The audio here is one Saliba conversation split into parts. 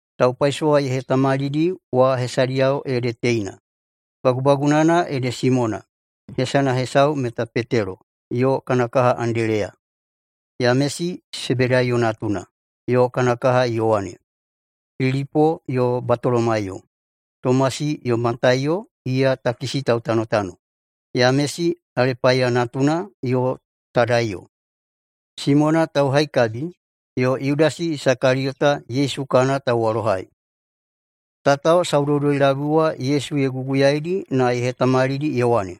Taupaisowa ye hetamalidi wa hesadiyao ede teina: Bagubagunana ede Simona, hesana hesau meta Petelo, yo kana kaha Andeleya. Yamesi Sebedaiyo natuna, yo kana kaha Yowane. Pilipo yo Batolomaiyo, Tomasi yo Mataiyo, iya takisi tautanotano, Yamesi Alepaiya natuna, yo Tadaiyo, Simona Tauhaikabi, yo Yudasi Isakaliyota, Yesu kana tauwalohai. Tatao saudoudoi-labui wa Yesu ye guguyaidi na ye hetamalidi ye wane,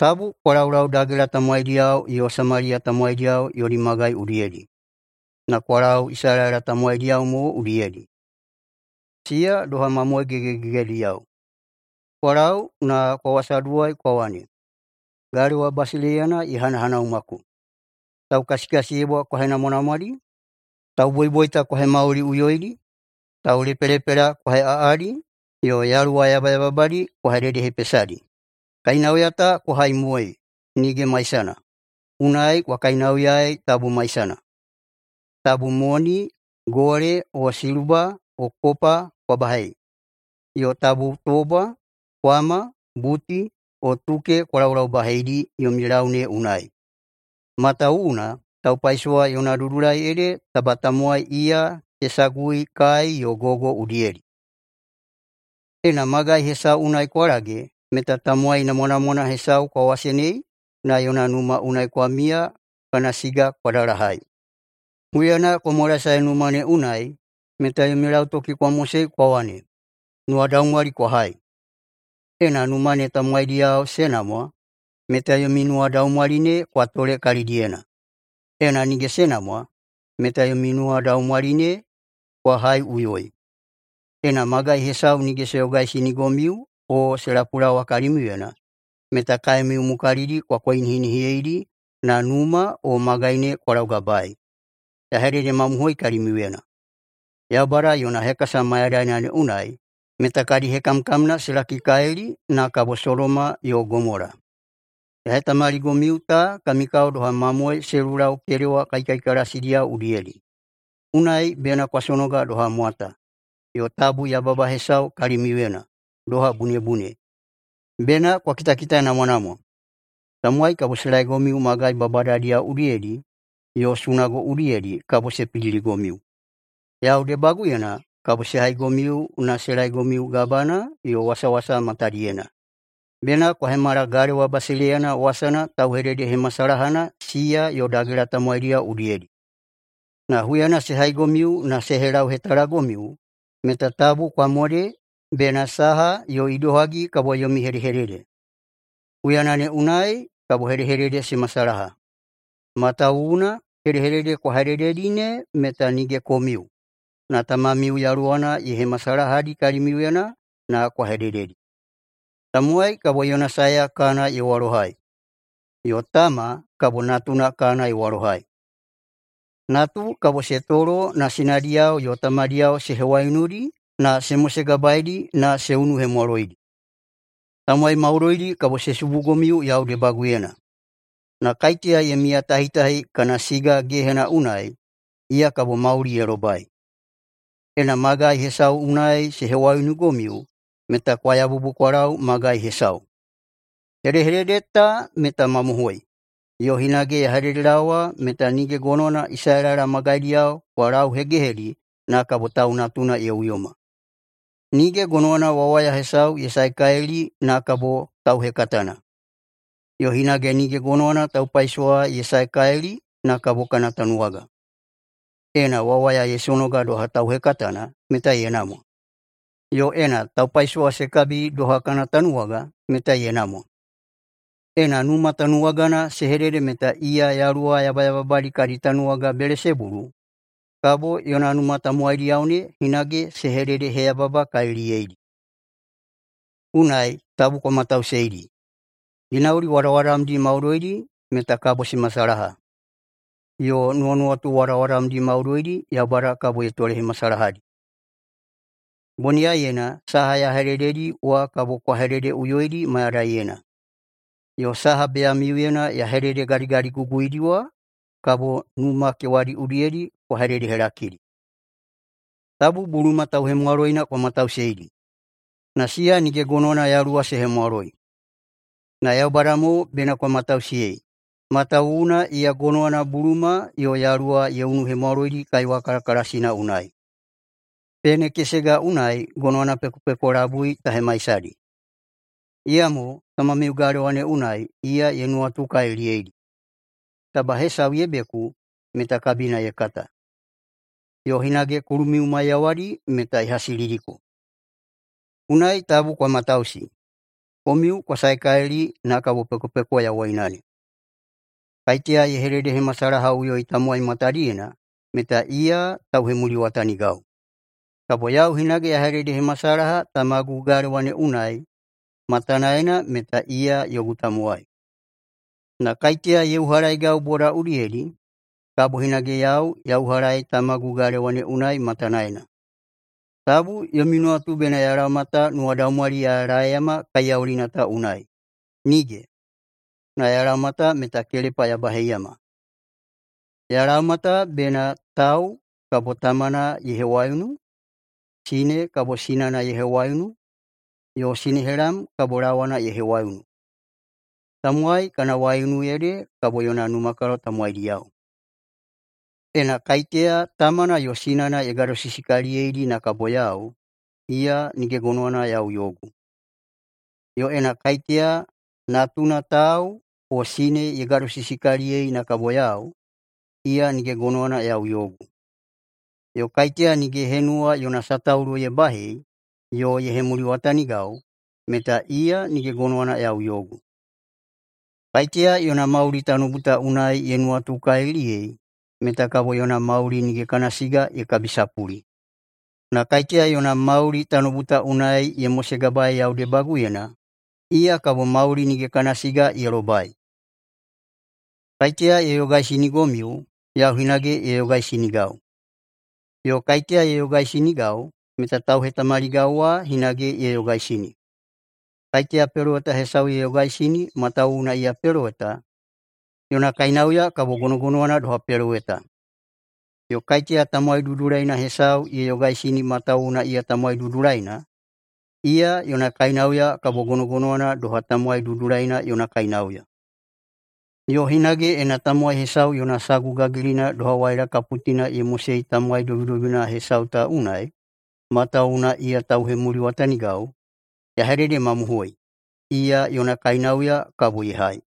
“Tabu kwa laulau dagela tamowaidiyao yo Samaliya tamowaidi yodi magai udiyedi, na kwa lau Isalaela tamowaidiyao mo udiyedi, siya doha mamoe gegegegediyao. Kwa lau na kwa wasaduwai kwa wane, ‘Galewa basileiyana ye hanahanaumako.’ Taukasikasiyebwa kwa henamwanamwadi, tauboiboita kwa hemauliꞌuyoidi, taulepelepela kwa heꞌaꞌadi, yo yaluwa yabayababadi kwa hededehepesadi. Kainauya ta kwa haimoei nige maisana, unai kwa kainauyaei, tabu maisana. Tabu moni gole o siluba o kopa kwa baheidi, yo tabu tobwa, kwama, buti, yo tuke kwa laulaubaheidi yomi lau ne unai. Matawuwuna taupaisowa yona dudulai ede taba tamowai iya se sagui kai [yo gogo] udiyedi. Ena magai hesau unai kwa lage meta tamowai namwanamwana hesau kwa wasenei na yona numa unai kwa miya kana siga kwa dalahai. Huyana kwa mwalaesae numa ne unai meta yomi lautoki kwa mosei kwa wane, ‘Nuwadaumwali kwa hai!’ Ena numa ne tamowaidiyao se namwa, meta yomi nuwadaumwali ne kwa tole kalidiyena. Ena nige se namwa, meta yomi nuwadaumwali ne kwa haiꞌuyoi. Ena magai hesau nige se yogaisinigomiu o se lapulaowa kalimiuyena, meta kaemiu mukalidi kwa koinihinihiyeidi na numa o magai ne kwa laugabae. Ya hededemamohoi kalimiuyena: Yaubada yona hekasa mayadaina ne unai meta kadi hekamkamna se lakikalili, na kabo Sodoma yo Gomola.” “Ya hetamaligomiu ta kami kao doha mamoe se lulau kedewa kaikaikalasidiyao udiyedi. Unai bena kwa sonoga doha mwata, yo tabu yababa hesau kalimiuyena, doha bunebune. Bena kwa kitakitanamwanamwa, tamowai kabo se laegomiu magai babadadiyao udiyedi, yo sunago udiyedi kabo se pidiligomiu. Yau debaguyena kabo se haigomiu na se laegomiu gabana yo wasawasa matadiyena, bena kwa hemala [galewa basileiyana wasana] tauhededehemasalahana siya yo dagela tamowaidiyao udiyedi. Na huyana se haigomiu na se helauhetalagomiu meta tabu kwa mode bena saha yo idohagi kabo yomi hedehedede. Huyana ne unai kabo hedehedede se masalaha. Matawuwuna hedehedede kwa hedededi ne meta nige komiu, na Tamamiu Yaluwana ye hemasalahadi kalimiuyena na kwa hedededi. Tamowai kabo yona saeya kana ye walohai, yo tama kabo natuna kana ye walohai. Natu kabo se tolo na sinadiyao yo tamadiyao se hewaiunudi na se mosegabaeidi na se unuhemwaloidi. Tamowai maudoidi kabo se subugomiu yau debaguyena. Na kaiteya ye miyatahitahi kana siga gehena unai, iya kabo mauli ye lobai. Ena magai hesau unai se hewaiunugomiu meta kwa yabubu kwa lau magai hesau. Hedehedede ta meta mamohoi, yo hinage ya hededelaowa meta nige gonowana Isalaela magaidiyao kwa lauhegehedi na kabo Tau Natuna ye uyoma. Nige gonowana wawaya hesau ye saekalili na kabo tauhekatana. Yo hinage nige gonowana taupaisowa ye saekalili na kabo kana tanuwaga. Ena wawaya ye sonoga doha tauhekatana meta ye namwa, yo ena taupaisowa se kabi doha kana tanuwaga, meta ye namwa. Ena numa tanuwagana se hedede meta iya yaluwa yabayababadi kadi tanuwaga Belesebulu, kabo yona numa tamowaidiyao ne hinage se hededeheyababakaliliyeidi.” “Unai, tabu kwa matausiyeidi! Ginauli wadawadamdi maudoidi meta kabo se masalaha, yo nuwanuwatu wadawadamdi maudoidi Yaubada kabo ye tolehemasalahadi. Boniyaiyena saha ya hedededi wa kabo kwa hededeꞌuyoidi mayadaiyena, yo saha beyamiuyedi ya hededegadigadiguguyedi wa kabo numa kewadi udiyedi kwa hededehelakidi. Tabu buluma tauhemwaloina kwa matausiyeidi, na siya nige gonowana yaluwa se hemwaloi. Na Yaubada mo bena kwa matausiyei, matawuwuna iya gonowana buluma yo yaluwa ye unuhemwaloidi kaiwa kalakalasina unai. Pene kesega unai gonowana pekopeko labui ta hemaisadi. Iyamo Tamamiu galewa ne unai, iya ye nuwatukaliliyeidi. Taba hesau ye beku, meta kabina ye kata. Yo hinage kulumiu maiyawadi meta ye hasilidiko. Unai tabu kwa matausi. Komiu kwa saekalili na kabo pekopeko yawoina. Kaiteya ye hededehemasalahaꞌuyoi tamowai matadiyena meta iya tauhemuliwatanigau, kabo yau hinage ya hededehemasalaha Tamagu galewa ne unai matanaena meta iya yogu tamowai. Na kaiteya ye uhalaegau boda udiyedi, kabo hinage yau ya uhalaei Tamagu galewa ne unai matanaena. Tabu yomi nuwatu bena ya laoma ta nuwadaumwali ya laeiyama kaiyaulina ta unai. Nige! Na ya laoma ta meta kelepa ya baheiyama. Ya laoma ta bena ‘tau kabo tamana ye hewaiunu, sine kabo sinana ye hewaiunu, yo sinehelam kabo lawana ye hewaiunu. Tamowai kana waiunu ede kabo yona numakalo tamowaidiyao.’ Ena kaiteya tamana yo sinana ye gadosisikaliliyeidi na kabo yau, iya nige gonowana yau yogu. Yo ena kaiteya natuna tau o sine ye gadosisikaliliyeidi na kabo yau, iya nige gonowana yau yogu. Yo kaiteya nige ye henuwa yona sataulo ye bahei yo ye hemuliwatanigau meta iya nige gonowana yau yogu. Kaiteya yona mauli [tanoubu ta unai] ye nuwatukaliliyei meta kabo yona mauli [nige kana siga] ye kabisapuli. Na kaiteya yona mauli [tanoubu ta unai] ye mosegabaei yau debaguyena, iya kabo mauli [nige kana siga] ye lobai. Kaiteya ye yogaisinigomiu, yau hinage ye yogaisinigau. Yo kaiteya ye yogaisinigau meta tauhetamaligau wa hinage ye yogaisini. Kaiteya peloweta hesau ye yogaisini matawuwuna iya peloweta, yona kainauya kabo gonogonowana doha peloweta. Yo kaiteya tamowai dudulaina hesau ye yogaisini matawuwuna iya tamowai dudulaina, iya yona kainauya kabo gonogonowana doha tamowai dudulaina yona kainauya. Yo hinage ena tamowai hesau yona sagu gagilina doha waila kaputina ye mosei tamowai dobidobina hesau ta unai, matawuwuna iya tauhemuliwatanigau, ya hededemamohoi: Iya yona kainauya kabo ye hai.”